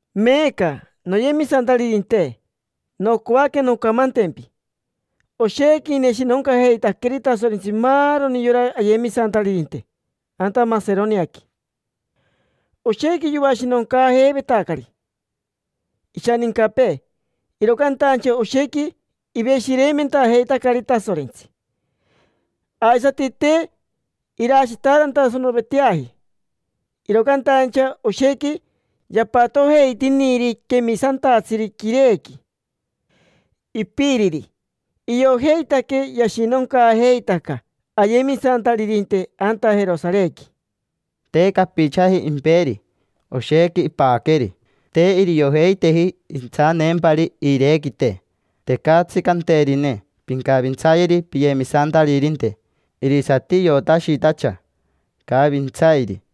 Meeca, noyemisantaririnte, nocoaque noncamantempi oshequi ineshinoncajeitaqueri Tasorentsi maaroni yora ayemisantaririnte anta Maseroniaqui. Oshequi yoashinoncaajeivetacari ishanincapee, iro cantaincha oshequi iveshireimentajeitacari Tasorentsi. Aisati te irashitaarantasanoveteaji, iro cantaincha oshequi yapatojeitiniri quemisantatsiri quirequi, ipiriri. Iojeitaque yashinoncaajeitaca ayemisantaririnte anta Jerosarequi. Te capichaji imperi, oshequi ipaqueri. Te iriojeiteji intsaneempari iirequite. Tecatsi canterine: “Pincavintsayeri piyemisantaririnte”. Irisati iotashitacha icavintsairi.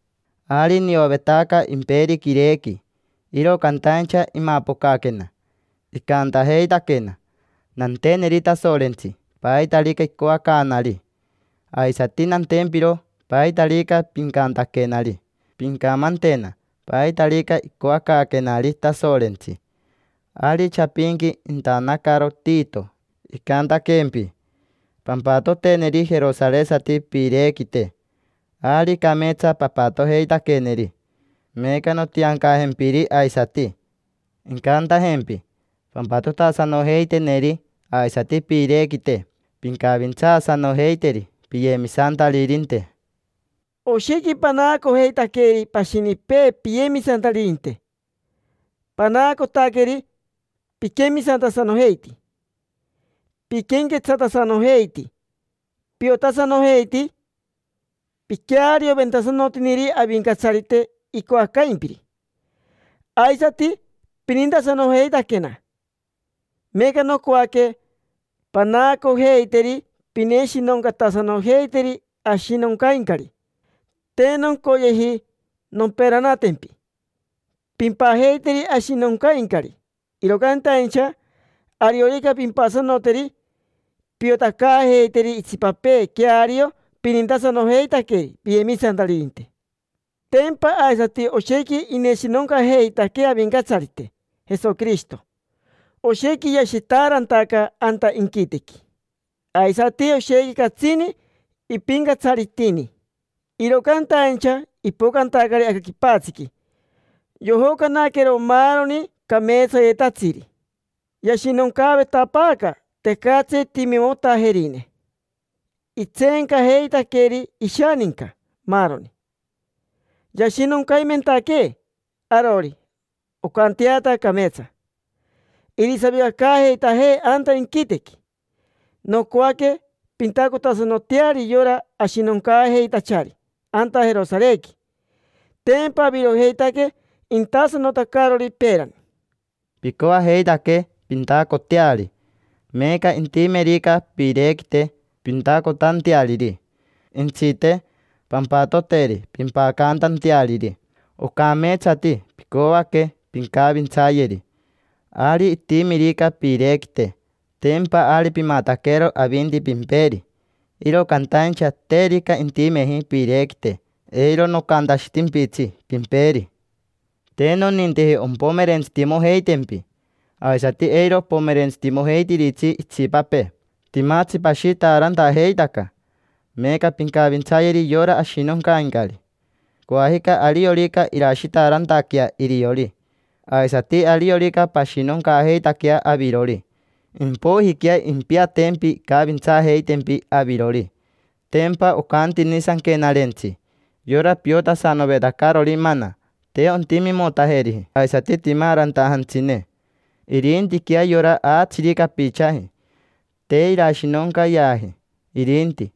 Ari niovetaca imperi quirequi, iro cantaincha imapocaquena icantajeitaquena: “Nanteneri Tasorentsi paitarica icoacaanari, aisati nantempiro paitarica pincantaquenari. Pincamantena paitarica icoacaaquenari Tasorentsi”. Ari chapinqui intanacaro Tito icantaquempi: “Pampatoteneri jerosaresati piirequite”. Ari cameetsa papatojeitaqueneri. Meeca nontiancajempiri aisati incantajempi pampatotasanojeiteneri aisati piirequite, pincavintsaasanojeiteri piyemisantaririnte. Oshequi panaacojeitaqueri pashinipee piyemisantaririnte: panaacotaqueri piquemisantasanojeiti, piquenquetsatasanojeiti, piotasanojeiti, piquearioventasanotiniri Avincatsarite icoacaimpiri, aisati pinintasanojeitaquena. Meeca nocoaque panaacojeiteri pineshinoncatasanojeiteri ashinoncaincari. Te noncoyeji nomperanatempi pimpajeiteri ashinoncaincari, iro cantaincha ariorica pimpasanoteri, piotacaajeiteri itsipapee queario pinintasanojeitaqueri piyemisantaririnte. Tempa aisati oshequi ineshinoncajeitaquee Avincatsarite Jesoquirishito. Oshequi yashitaarantaca anta inquitequi, aisati oshequi catsini ipincatsaritini, iro cantaincha ipocantacari aca quipatsiqui, yojocanaquero maaroni cameetsayetatsiri. Yashinoncaavetapaaca: tecatsi timimotajerine, itseencajeitaqueri ishaninca, maaroni. Yashinoncaimentaquee arori, oncanteata cameetsa irisavicacaajeitajee anta inquitequi. Nocoaque pintacotasanoteari yora ashinoncaajeitachari anta Jerosarequi: tempa avirojeitaque intasanotacarori peerani. Picoajeitaque pintacoteari: meeca, intimerica piirequite pintacotanteariri, jentsite, pampatoteri pimpacantanteariri. Ocameetsati picoaque pincavintsayeri. Ari itimirica piirequite, tempa ari pimataquero avinti pimperi. Iro cantaincha terica intimeji piirequite, eiro nocantashitimpitsi pimperi. Te noninteji ompomerentsitimojeitempi, aisati eiro opomerentsitimojeitiritsi itsipapee. Timatsi pashitaarantajeitaca, meeca pincavintsayeri yora ashinoncaincari. Coajica ariorica irashitaarantaquea iriori, aisati ariorica pashinoncaajeitaquea avirori, impoijiquea impiatempi incavintsaajeitempi avirori. Tempa ocantini Sanquenarentsi: “Yora piotasanovetacarori mana, te ontimimotajeriji aisati timaarantajantsine. Irintiquea yora aatsiri capichaji, te irashinoncayeaji irinti.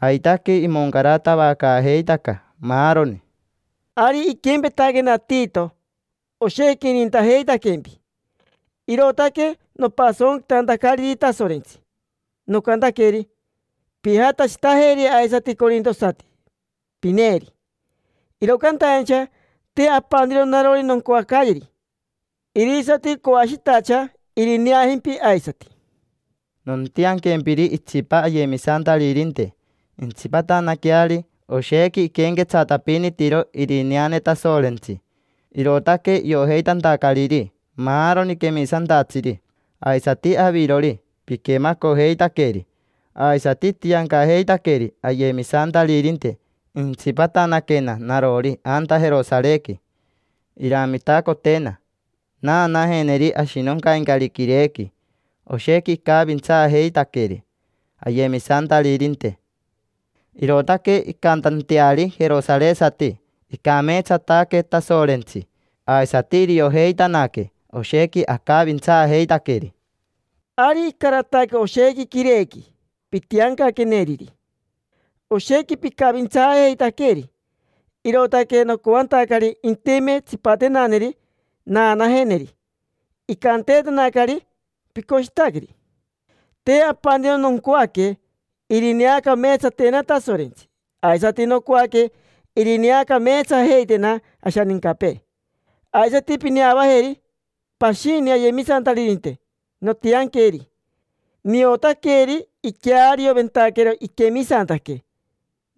Aitaque, imoncaratavacaajeitaca maaroni”. Ari iquempetaquena Tito, oshequi inintajeitaquempi, irootaque nopasonquitantacariri Tasorentsi. Nocantaqueri: “Pijatashitajeri aisati corintosati, pineeri”. Iro cantaincha te apaniro narori noncoacayeri, irisati coashitacha irineajempi aisati. Nontianquempiri itsipa ayemisantaririnte intsipatanaqueari. Oshequi iquenquetsatapinitiro irineane Tasorentsi, irootaque iojeitantacariri maaroni quemisantatsiri. Aisati avirori, piquemacojeitaqueri. Aisati itiancajeitaqueri ayemisantaririnte intsipatanaquena narori anta Jerosarequi, iramitacotena naanajeneri ashinoncaincari quirequi. Oshequi icavintsaajeitaqueri ayemisantaririnte, irootaque incantanteari jerosaresati: “Icameetsataque Tasorentsi”. Aisati iriojeitanaque oshequi acavintsaajeitaqueri. Ari icarataque oshequi quirequi pintianqueneriri, oshequi picavintsaajeitaqueri. Irootaque nocoantacari intime tsipatenaneri naanajeneri. Icanteetanacari: “Picoshitaqueri”. Te apaniro noncoaque irineacameetsatena Tasorentsi, aisati nocoaque irineacameetsajeitena ashanincapee. Aisati pineavajeri pashini ayemisantaririnte nontianqueri. Niotaqueri, iquearioventaquero iquemisantaque.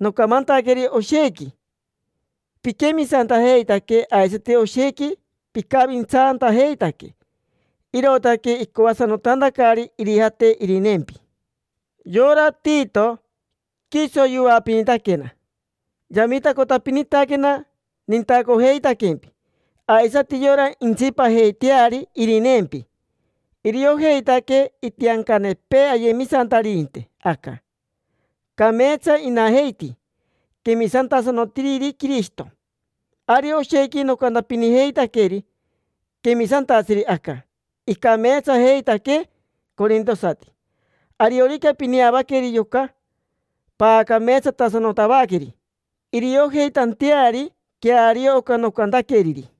Nocamantaqueri oshequi piquemisantajeitaque aisati oshequi picavintsantajeitaque, irootaque icoasanotantacari irijate irineempi. Yora Tito, quiso yoapinitaquena, yamitacotapinitaquena nintacojeitaquempi. Aisati yora intsipajeiteari irineempi, iriojeitaque itiancanepee ayemisantaririnte aca. Cameetsa inajeiti, quemisantasanotiriri Quirishito. Ari oshequi nocantapinijeitaqueri quemisantatsiri aca: “Icameetsajeitaque corintosati”. Ariorica pineavaqueri yoca, paacameetsatasanotavaqueri iriojeitanteari queario oca nocantaqueriri.